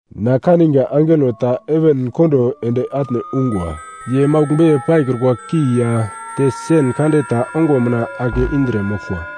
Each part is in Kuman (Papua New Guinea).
Na kaniga angelo ta heven kondo ende atne ungwa ye maugl beiye paikrukwa ki ya te sen kande ta ongo mina ake indre moglkwa.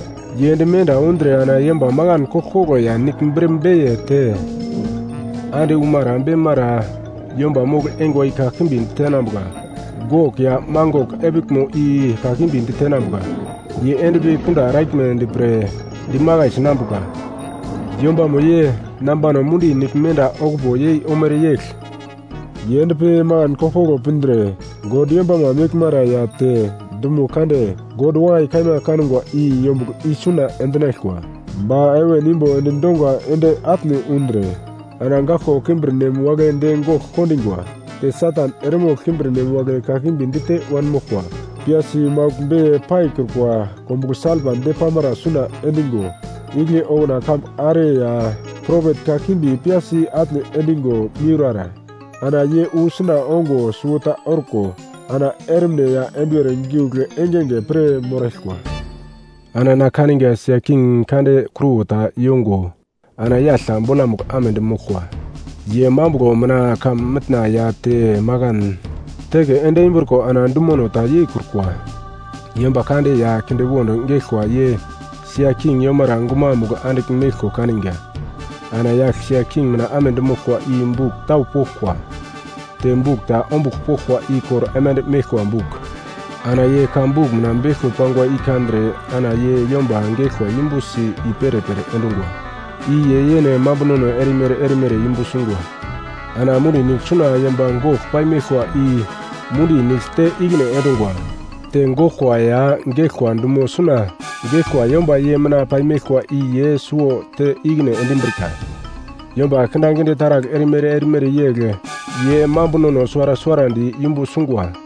Ye ende menda undre ana yomba makan koglkoglo ya nigl bre beiye te ande umara beimara yomba mogl-eingwa i kakimbi ditenambuka. Gok ya Mangok epiglmo i kakimbi ditenambuka, ye endpi kunda eraglmedi pre dimakai sinambuka. Yombamo ye nambano mundi nigl menda okupo yei omere yegl. Ye endpi makan koglkoglo pindre God yombama meglmara ya te dumo kande God wakai kaima kangwa i yombugl isuna endinaglkwa. Ba heven imbo endi donga ende atne undre ana goglko kimbirnem wagle de gogl kondingwa. Te Satan eremogl kimbirnem wagle kakimbi dite wanmoglkwa, piyasi maugl beiye paikrukwa kombuglo salpa depamara suna endingo, igle okuna kambu are ya propet kakimbi piyasi atne endingo miurara, ana ye wu suna ongo suwota orko ana ermine ya enduwer giugl engenge pir moraglkwa. Ana na kaniga sia king kande kruwo ta yongo ana yagl ta bolamugl amedi moglkwa. Ye mambuglo mina heven ya te makan teke endimbriko ana dumono ta yeikrukwa. Yomba kande ya kindewond geglkwa ye sia king yomara gumamugl andigl meglko kaniga. Ana yagl sia king mina amedi moglkwa i buk tau poglkwa, te buk ta ombugl poglkwa i kor aimande meglkwa buk. Ana ye ka buk mina beglko pangwa i kandre ana ye yomba geglkwa yumbusi i-perepere endungwa, i ye yene mambunono erimere erimere yumbu sungwa. Ana mundi nigl suna yomba gogl paimeglkwa i mundi nigl te ikine endungwa. Te goglkwa ya geglkwa dumo suna geglkwa yomba ye mina paimeglkwa i ye suwo te ikine endimbrika, yomba kindaginde taragl erimere erimere yegl ye mambunono suwara suwarandi yumbu sungwa.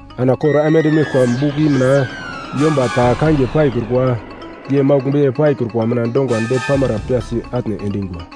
Ana kor aimande meglkwa buk i mina yomba ta kangiye paikrukwa ye maugl beiye paikrukwa mina donga depamara piyasi atne endingwa.